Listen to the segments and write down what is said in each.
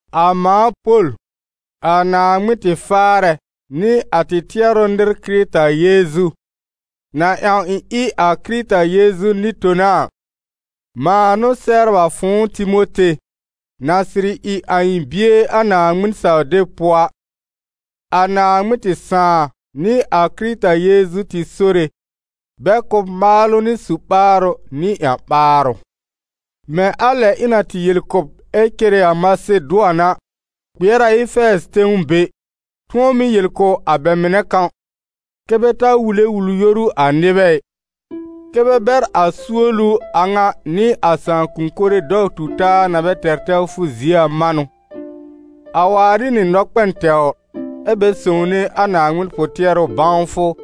A mãa Pol, a Naaŋmɩn tɩ Faarɛ nɩ a tɩ tɩɛrʋ-nɩr Kɩrɩta Yeezu, na ƴãw ɩ̃ ɩ a Kɩrɩta Yeezu nɩ-tona a, mãa n'ʋ sɛbr a fʋ̃ʋ Timote, na sɩrɩ ɩ a ɩ̃ bie a Naaŋmɩn-saw-deb pʋɔ a. A Naaŋmɩn tɩ Sãà nɩ a Kɩrɩta Yeezu tɩ Sore, bɛ kʋ̀ b maalʋ nɩ su-ɓaarʋ nɩ ƴã-ɓaarʋ. Mɛ̃ a lɛ ɩ̃ na tɩ yel kʋ̀ b ɛ cere a Masedʋan a, kpɩɛr a Efɛɛzɩ tẽw be, tʋ̃ɔ mɩ́ yel kʋ̀ a bɛ mɩnɛ kãw, kɛ́ bɛ ta wule wul-yoru a nɩbɛ ɩ, kɛ́ bɛ bɛr a suolu a ŋa nɩ a sãakʋm mɩnɛ dɔw-tu-taa na bɛ tɛr tɛwfʋ zie a manʋ; a waar ɩ nɩ nɔkpɛn tɛwr, ɛ́ bɛ sõwne a Naaŋmɩn pʋ-tɩɛrʋ bãwfʋ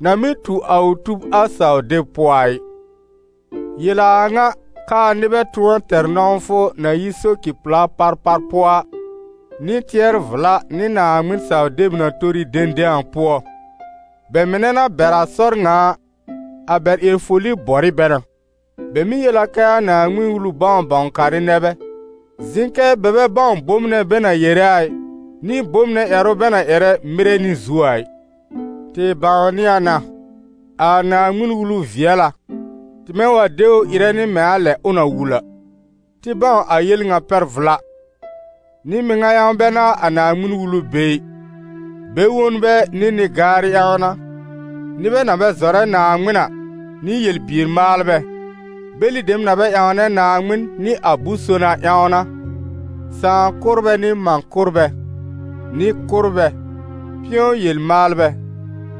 na mɩ́ tu a ʋ tub a saw-deb pʋɔ a ɩ. Yel a a ŋa, k'aa nɩbɛ tʋ̃ɔ tɛr nɔ̃wfʋ na yi soci-pla parpar pʋɔ a, nɩ tɩɛr-vla nɩ Naaŋmɩn-saw-deb na tori dẽdẽ a pʋɔ. Bɛ mɩnɛ na bɛr a sɔr ŋa a, a bɛ ƴɛr-foli bɔr ɩ bɛ na. Bɛ mɩ́ yel a kɛ a Naaŋmɩn Wulu-bãw-bãw-karɩ nɛ bɛ, zɩ̃ kɛ bɛ bɛ bãw bom nɛ bɛ na yere a ɩ, nɩ bom nɛ ƴɛrʋ bɛ na ƴɛrɛ mɩrɛ nɩ zu a ɩ. Tɩ bãwnɩ a na, a Naaŋmɩn-Wulu vɩɛl a, tɩmɛ wa de ʋ ɩrɛ nɩ mɛ̃ a lɛ ʋ na wul a. Tɩ bãw a yel ŋa pɛr vla: nɩ-mɩŋa ƴãw bɛ n'a a Naaŋmɩn-Wulu be ɩ; bɛ-wonbɛ nɩ nɩ-gaarɩ ƴãw n'a, nɩbɛ na bɛ zɔrɛ Naaŋmɩn a, nɩ yel-bier maalbɛ, bɛlɩ dem na bɛ ƴãwnɛ Naaŋmɩn nɩ a bʋ̃-son a ƴãw n'a, sãà-kʋ́rbɛ nɩ mã-kʋ́rbɛ, nɩ-kʋ́rbɛ, pɩ̃ɔ yel-maalbɛ,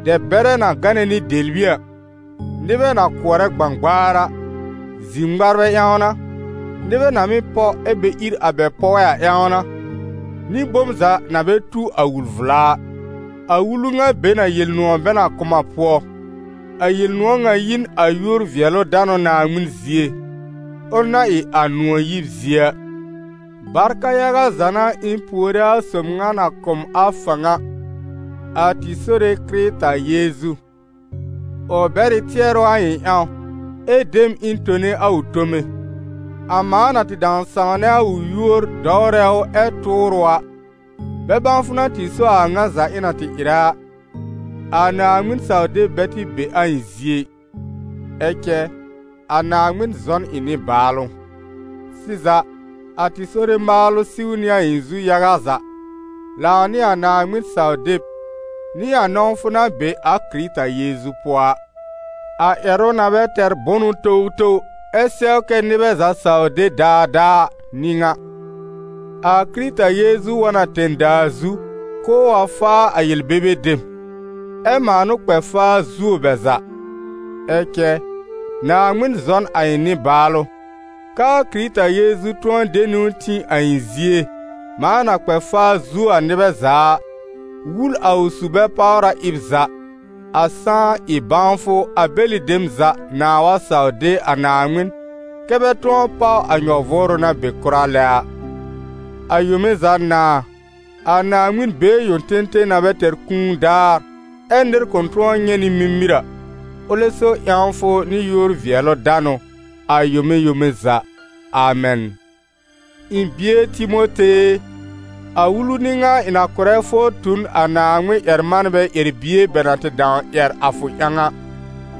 dɛb-bɛrɛ na gánɛ nɩ dɛbli a, nɩbɛ na kʋɔrɛ gbãgbaar a, zir-ŋmarbɛ ƴãw n'a, nɩbɛ na mɩ́ pɔ ɛ bɛ ír a bɛ pɔɛ a ƴãw n'a, nɩ bom za na bɛ tu a wul-vla a. A wulu ŋa be n a Yel-nʋ̃ɔ̀ bɛ na kʋ̀ m a pʋɔ; a Yel-nʋ̃ɔ̀ ŋa yi n a yúor-vɩɛlʋ-danʋ Naaŋmɩn zie, ʋl na ɩ a nʋ̃ɔ̀ yib zie a. Barka yaga za n'a ɩ̃ puore a sob ŋa na kʋ̀ m a fãw a, a tɩ Sore Kɩrɩta Yeezu: ʋ bɛr ɩ tɩɛrʋ a ɩ̃ ƴãw, ɛ de m ɩ̃ tone a ʋ tome, a mãa na tɩ dãw sãwnɛ a ʋ yúor, dɔwrɛ ʋ ɛ tʋʋr ʋ a. Bɛ-bãwfʋ n'a tɩ so a a ŋa za ɩ̃ na tɩ ɩrɛ a, a Naaŋmɩn-saw-deb bɛ tɩ be a ɩ̃ zie ɩ. Ɛ cɛ, a Naaŋmɩn zɔ n ɩ̃ nɩbaalʋ. Sɩza, a tɩ Sore maalʋ siw nɩ a ɩ̃ zu yaga za, lãw nɩ a Naaŋmɩn-saw-deb nɩ a nɔ̃wfʋ na be a Kɩrɩta Yeezu pʋɔ a. A ƴɛrʋ na bɛ tɛr bʋnʋ towtow, ɛ sɛw kɛ́ nɩbɛ za saw de daadaa a n'ɩ ŋa: a Kɩrɩta Yeezu wa n a tẽ-daa zu k'ʋʋ wa faa a yel-bebe dem, ɛ mãa n'ʋ kpɛ faa zuo bɛ za. Ɛ cɛ, Naaŋmɩn zɔ n a ɩ̃ nɩ-baalʋ, k'aa Kɩrɩta Yeezu tʋ̃ɔ de niwn tĩ a ɩ̃ zie, mãa na kpɛ faa zuo a nɩbɛ za a, wul a ʋ su-bɛ-páwra ɩb za, a sãá ɩ bãwfʋ a bɛlɩ dem za nãá wa saw de a Naaŋmɩn, kɛ́ bɛ tʋ̃ɔ páw a nyɔ-vʋʋrʋ na be kʋra lɛ a. A yome za Nãa, a Naaŋmɩn been yõ tẽtẽ na bɛ tɛr kũu daar, ɛ́ nɩr kʋ̃ tʋ̃ɔ nyɛ̃ nɩ mimir a, ʋlɛ so ƴãwfʋ nɩ yúor-vɩɛlʋ-danʋ, a yome yome za. Amɛn. Ɩ̃ bie Timote e, a wulu n'ɩ ŋa ɩ̃ na kʋ̀rɛ fʋ tu n a Naaŋmɩn-ƴɛr-manbɛ ƴɛr-bie bɛ na tɩ dãw ƴɛr a fʋ ƴãw a.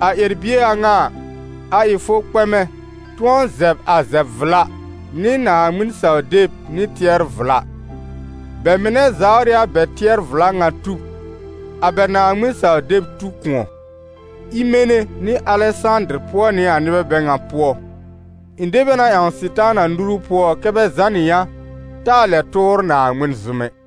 A ƴɛr-bie a ŋa a, a ɩ fʋ kpɛmɛ tʋ̃ɔ zɛb a zɛb-vla, nɩ Naaŋmɩn-saw-deb nɩ tɩɛr-vla. Bɛ mɩnɛ zawr ɩ a bɛ tɩɛr-vla ŋa tub, a bɛ Naaŋmɩn-saw-deb tu kʋ̃ɔ. Imene nɩ Alɛsãdɩr pʋɔ nɩ a nɩbɛ bɛ ŋa pʋɔ; ɩ̃ de bɛ na ƴãw Sɩtaana nuru pʋɔ kɛ́ bɛ zànɩ yã, taa lɛb tʋʋr Naaŋmɩn zʋm ɛ.